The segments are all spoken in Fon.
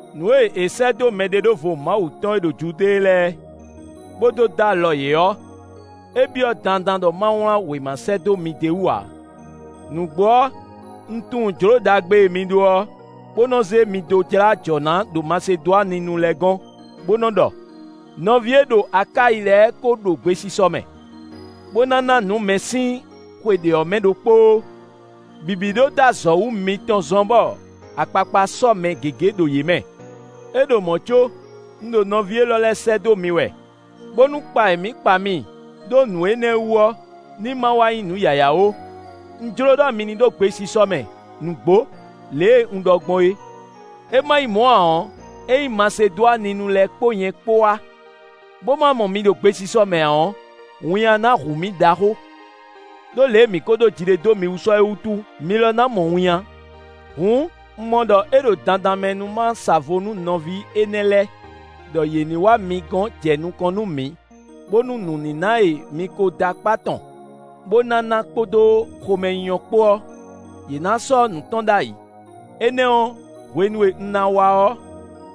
Nǔ e è sɛ́ dó mɛɖeɖóvo Mawu tɔn e ɖo Judée lɛ́ɛ, bó dó dó alɔ yě ɔ́, é byɔ́ dandan ɖɔ ma wlán wěma sɛ́ dó mi d'é wú ǎ. Nǔgbó ɔ́, un tunwun jlǒ ɖagbe e mi ɖó ɔ́, bó nɔ́ zé mi dó jlá ajɔ̌ ná ɖo Masedwaninu lɛ́ɛ gɔ́n, bó nɔ́ ɖɔ: “Nɔví e ɖo Akáyi lɛ́ɛ ko ɖo gbesisɔ mɛ, bó ná ná nǔ mɛ sín xwe ɖě ɔ́ mɛ ɖokpóó.” Bǐbí ɖó dó azɔ̌ wú mitɔn zɔ́n, bɔ akpakpa sɔ́ mɛ gěgé ɖo yě mɛ. É ɖo mɔ̌ có, un ɖo nɔví élɔ́ lɛ́ɛ sɛ́ dó mi wɛ, bónú kpa e mǐ kpa mi ɖó nǔ énɛ́ wú ɔ́ ní ma wá nyí nǔ yǎyá ó: un jló ɖɔ mi ní ɖo gbesisɔ mɛ nǔgbó, lě e un ɖɔ gbɔn é. É ma nyí mɔ̌ ǎ ɔ́, ényí Masedwaninu lɛ́ɛ kpó nyɛ kpó wá, bó má mɔ mi ɖo gbesisɔ mɛ ǎ ɔ́, winnyá ná hu mǐ ɖaxó, ɖó lě e mǐ kó ɖó ji ɖe dó mi wú sɔ́ é wútu; mi lɔ ná mɔ winnyá. Hǔn, un mɔ ɖɔ é ɖo dandan mɛ nú ma sa vo nú nɔví énɛ́ lɛ́ɛ ɖɔ yě ní wá gɔ̌n mitɔn jɛ nukɔn nú mǐ, bónú nǔníná e mi ko dó akpá tɔn, bó ná ná kpódó xomɛnyínyɔ́ kpó ɔ́, yě ná sɔ́ nǔ tɔn ɖ'ayǐ. Énɛ́ ɔ́, hwenu e un ná wá ɔ́,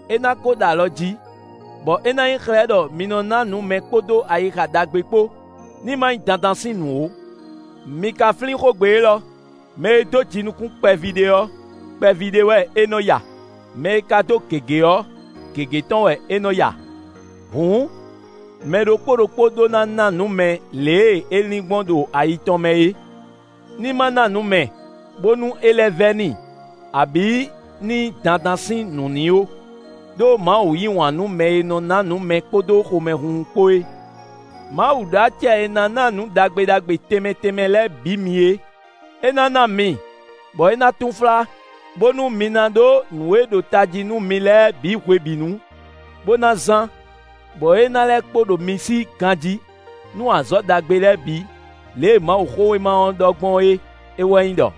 é ná ko ɖo alɔ jí, bɔ é ná nyí xlɛ́ ɖɔ mi nɔ́ ná nǔ mɛ kpódó ayixa ɖagbe kpó; ní ma nyí dandan sín nǔ ó. Mi ka flín xógbe élɔ́: mɛ e dó jinukún kpɛví ɖé ɔ́, kpɛví ɖé wɛ é nɔ ya; mɛ e ka dó gěgé ɔ́, gěgé tɔn wɛ é nɔ́ ya. Hǔn, mɛ ɖokpó ɖokpó ɖó ná ná nǔ mɛ lě e é lin gbɔn ɖo ayi tɔn mɛ é; ní ma ná nǔ mɛ, bónú é lɛ́ vɛ́ n'i, abǐ ní nyí dandan sín nǔ n'i ó. Đó Mawu yí wǎn nú mɛ e nɔ ná nǔ mɛ kpódó xomɛhunhun kpó é. Mawu ɖó acɛ e ná ná nǔ ɖagbe ɖagbe tɛnmɛ tɛnmɛ lɛ́ɛ bǐ mi é, é ná ná mi, bɔ é ná túnflá, bónú mi ná ɖó nǔ e ɖo tají nú mi lɛ́ɛ bǐ hwebǐnu, bó ná zán, bɔ é ná lɛ́ kpo ɖo mi sí ganjí, nú azɔ̌ ɖagbe lɛ́ɛ bǐ. Lě e Mawuxówéma ɔ́ ɖɔ gbɔn é; é wɛ nyí ɖɔ: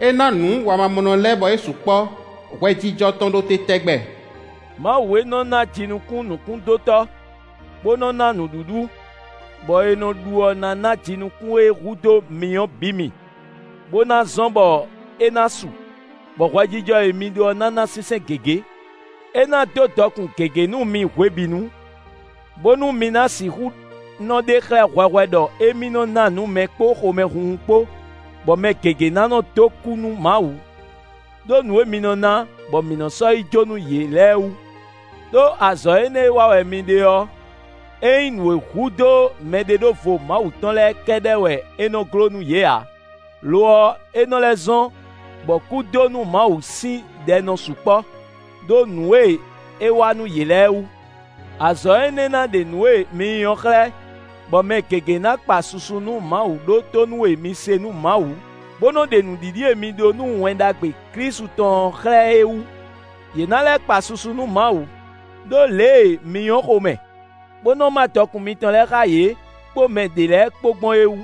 “É ná nǔ wamamɔnɔ lɛ́ɛ bɔ é sukpɔ́. Hwɛjijɔ tɔn ɖo te tɛgbɛ.” Mawu e nɔ ná jinukún nǔkúndótɔ́, bó nɔ́ ná nǔɖuɖu, bɔ è nɔ ɖu ɔ́ ná ná jinukún e hudó mi ɔ́ bǐ mi, bó ná zɔ́n bɔ é ná su, bɔ hwɛjijɔ e mi ɖó ɔ́ ná ná sínsɛ́n gěgé. É ná dó dɔkun gěgé nú mi hwebǐnu, bónú mi ná sixú nɔ ɖe xlɛ́ hwɛhwɛ ɖɔ émí nɔ́ ná nǔ mɛ kpó xomɛhunhun kpó, bɔ mɛ gěgé ná nɔ́ dó kú nú Mawu ɖó nǔ e mi nɔ ná, bɔ mǐ nɔ́ sɔ́ yi jó nú yě lɛ́ɛ wú. Đó azɔ̌ énɛ́ e wa wɛ mi ɖe ɔ́, é nyí nǔ e hudó mɛɖeɖóvo Mawu tɔn lɛ́ɛ kɛ́ɖɛ́ wɛ é nɔ́ gló nú yě ǎ; lo ɔ́, é nɔ́ lɛ́ zɔ́n, bɔ kú dó nú Mawu sín ɖɛ nɔ sukpɔ́, ɖó nǔ e é wa nǔ yě lɛ́ɛ wú. Azɔ̌ énɛ́ ná ɖe nǔ e mǐ nyí ɔ́ xlɛ́, bɔ mɛ gěgé ná kpa susu nú Mawu ɖó tónú e mi se nú Mawu, bó nɔ ɖe nǔɖiɖi e mi ɖó nú Wɛn Ɖagbe Klísu tɔn ɔ́ xlɛ́ é wú; yě ná lɛ́ kpa susu nú Mawu, ɖó lě e mi nyɔ́ xomɛ, bó nɔ má dɔkun mitɔn lɛ́ɛ xá yě, kpó mɛ ɖě lɛ́ɛ kpó gbɔn é wú.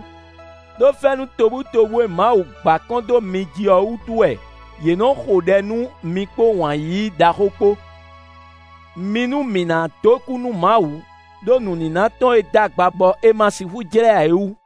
Đó fɛ́nú tobutóbú e Mawu gba kɔn dó mi jí ɔ́ wútu wɛ yě nɔ́ xo ɖɛ nú mi kpó wǎn yíyí ɖaxó kpó. Mi nú mǐ ná dó kú nú Mawu ɖó nǔníná tɔn e d'agba bɔ è ma sixú jlɛ́ ǎ é wú.